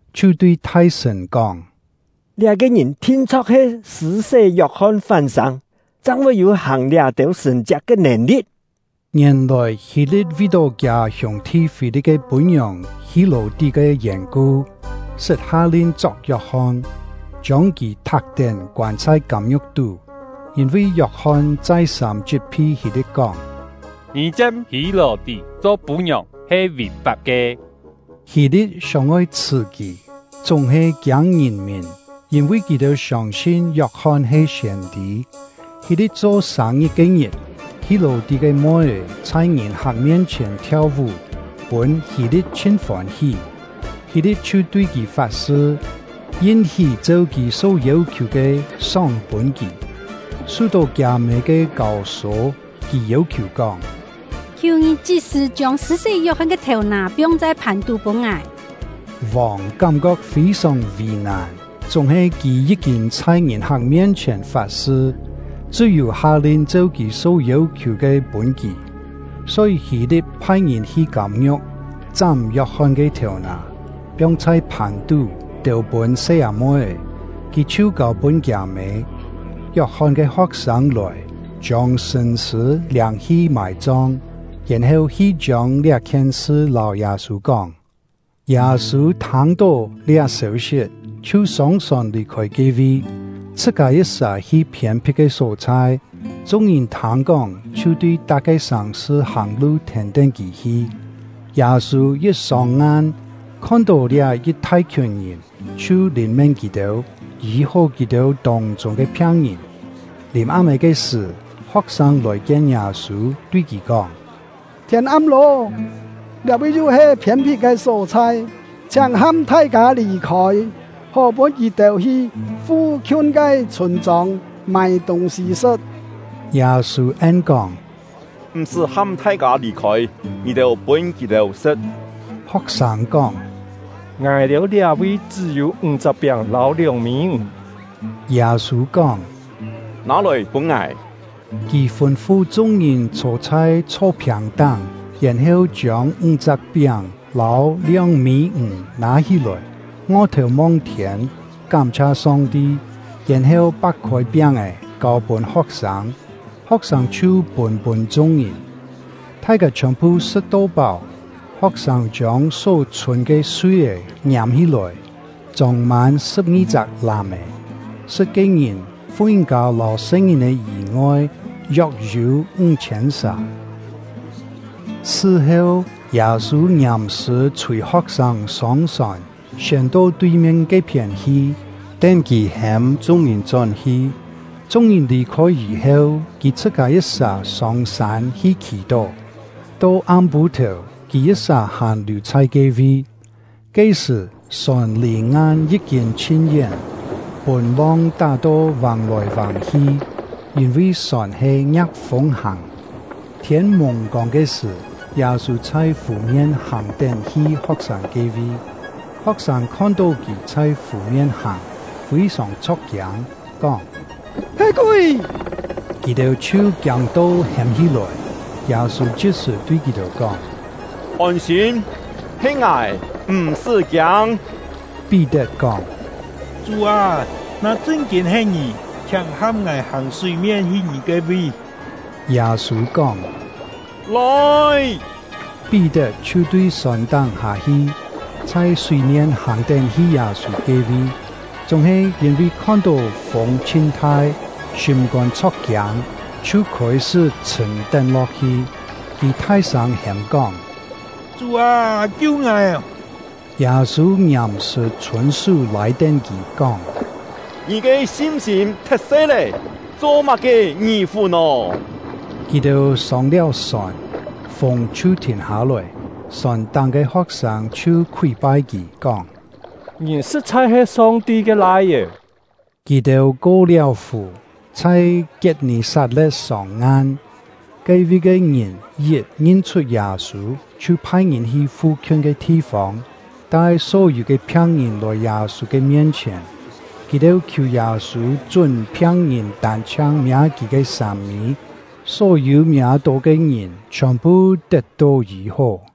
chhiu tui thai-sṳ̀n kóng: “Liá-ke ngìn thin-chho̍k he Sṳ̂-sé Yok-hon fán-sâng, chang voi yû hàng liá-têu sṳ̀n-chiak ke nèn-li̍t.” Ngièn-lòi, Hî-li̍t vi-tó kiâ hiûng-thi Fî-li̍t ke pû-ngiòng Hî-lò-tí ke yèn-ku, sṳt ha-lin chok Yok-hon, chiông kì thak-tén koân chhai kâm-ngiu̍k tú. Yîn-vi Yok-hon chai-sâm chit-phi Hî-li̍t kóng: “Ngì chiam Hî-lò-tí cho pû-ngiòng he vì-fap ke.” Hî-li̍t sióng-oi chhṳ̀ kì, chúng-he kiâng ngìn-mìn, yîn-vi kì-têu siông-sin Yok-hon he siên-tî. Hî-li̍t cho sâng-ngit ke-ngit, Hî-lò-tí ke moi-é chhai ngìn-hak mien-chhièn thiau-vú, pûn Hî-li̍t chhin fôn-hí. Hî-li̍t chhiu tui kì fat-sṳ, yin-hí cheu kì só yêu-khiù ke sóng-pûn kì. Su-tó kiâ-mê ke kâu-sô, kì yêu-khiù kóng: “Khiù ngì chit-sṳ̀ chiông Sṳ̂-sé Yok-hon ke thèu-nà piong chhai phàn-tú pûn ngài!” Vòng kám-kok fî-sòng vì-nàn, chúng-he kì yí-kîn chhai ngìn-hak mien-chhièn fat-sṳ, chṳ́-yû ha-lin cheu kì só yêu-khiù ke pûn kì. Só-yî, Hî-li̍t phai-ngìn hi kâm-ngiu̍k, chám Yok-hon ke thèu-nà, piong chhai phàn-tú, têu-pûn se-â-moi-é; kì chhiu kâu-pûn kiâ-mê. Yok-hon ke ho̍k-sâng lòi, chiông sṳ̂n-sṳ̂ liâng-hi mài-chong; yèn-heu hi chiông liá-khien sṳ lâu Yâ-sû kóng. Yâ-sû thâng-tó liá sêu-sit, chhiu sông-sòn lì-khôi ke-vi, chhṳ-kâ yit-sà hi phiên-phit ke só-chhai. Chung-ngìn thâng-kóng, chhiu tui tak-ke sàng-sṳ hàng-lu thèn-tén kì hi. Yâ-sû yit sông-ngan, khon-tó liá yit thai-khiùn ngìn, chhiu lìn-mén kì-têu, yî-hó kì-têu tông-chûng ke phiang-ngìn. Lìm-am-é ke sṳ̀, ho̍k-sâng lòi-kien Yâ-sû, tui kì kóng: “Thiên am lô, liá-vi yu he phiên-phit ke só-chhai, chhiáng ham thai-kâ lì-khôi, hó pûn kì-têu hi fu-khiun ke chhûn-chông mâi tûng-sî sṳ̍t.” Yâ-sû en-kóng: “M̀-sṳ́ ham thai-kâ lì-khôi; ngì-têu pûn kì-têu sṳ̍t!” Ho̍k-sâng kóng: “Ngài-têu liá-vi chṳ́-yû ńg-chak piáng lâu lióng-mî ǹg.” Yâ-sû kóng: “Nâ-lòi pûn ngài.” Kì fûn-fu chung-ngìn chhô chhai chhó-phiàng-táng, yèn-heu chiông ńg-chak piáng lâu lióng-mî ǹg nâ hí-lòi, ngo-thèu mong-thiên, kám-chhia Song-ti, yèn-heu pak-khôi piáng-è, kâu-pûn ho̍k-sâng; ho̍k-sâng chhiu pûn-pûn chung-ngìn. Thai-kâ chhiòn-phu sṳ̍t-to páu; ho̍k-sâng chiông só chhûn ke sui-é ngiâm-hí-lòi, chông-mân sṳ̍p-ngi-chak làm-è. Sṳ̍t ke ngìn, fu-ngìn-kâ lâu se-ngìn-è yî-ngoi, yok-yû ńg-chhiên sà. Sṳ-heu, Yâ-sû ngiàm-sṳ̀ chhûi ho̍k-sâng sông-sòn, siên to tui-mien ke-phién hi, tén kì hêm chung-ngìn chón-hi. Chung-ngìn lì-khôi yî-heu, kì chhṳ-kâ yit-sà sông-sân hi khì-tó; to am-pû-thèu kì yit-sà hàn liù chhai ke-vi. Ke-sṳ̀, sòn lì ngan yí-kîn chhin-yén, pûn long tá-to vàng-lòi vàng-hi, yîn-vi sòn he ngia̍k-fûng hàng. Thiên-mùng-kông ke sṳ̀, Yâ-sû chhai fù-mien hàng-tén hi ho̍k-sâng ke-vi. Ho̍k-sâng khon-tó kì chhai fù-mien hàng, fî-sòng chho̍k-kiâng, kóng: “He kúi!” Kì-têu chhiu kiâng-to hêm hí-lòi. Yâ-sû chit-sṳ̀ tui kì-têu kóng: “Ôn-sîm, he ngài, m̀-sṳ́ kiâng!” Pí-tet kóng: “Chú â, na chṳn-kîn he ngì, chhiáng ham ngài hàng súi-mien hi ngì ke-vi!” Yâ-sû kóng: “Lòi!” Pí-tet chhiu tui sòn-táng hâ-hi, chhai súi-mien hàng-tén hi Yâ-sû ke-vi. Chúng-he, yîn-vi khon-tó fûng chhin-thai, sîm-kôn chho̍k-kiâng, chhiu khôi-sṳ́ chhṳ̀m-tén lo̍k-hi; kì thai-sâng hêm-kóng: “Chú â, kiu ngài!” Yâ-sû ngiàm-sṳ̀ chhûn-sú lâi-tén kì, kóng: “Ngì ke sin-sîm thet-se lé, cho-má-ke ngì-fù nò?” Kì-têu sông-liáu sòn, fûng chhiu thìn hâ-lòi. Sòn-táng ke ho̍k-sâng chhiu khúi-pai kì, kóng: “Ngì sṳ̍t-chhai he Song-ti ke Lai-é.” Kì-têu ko-liáu fù, chhai Kiet-nì-sat-le̍t sông-ngan. Ke-vi ke ngìn yit ngin-chhut Yâ-sû, chhiu phai-ngìn hi fu-khiun ke thi-fông, tai só-yû ke phiang-ngìn lòi Yâ-sû ke mien-chhièn. Kì-têu khiù Yâ-sû chún phiang-ngìn tân-chhiang miâ kì ke sâm-mî; só-yû miâ-tó ke ngìn chhiòn-phu tet-tó yî-hó.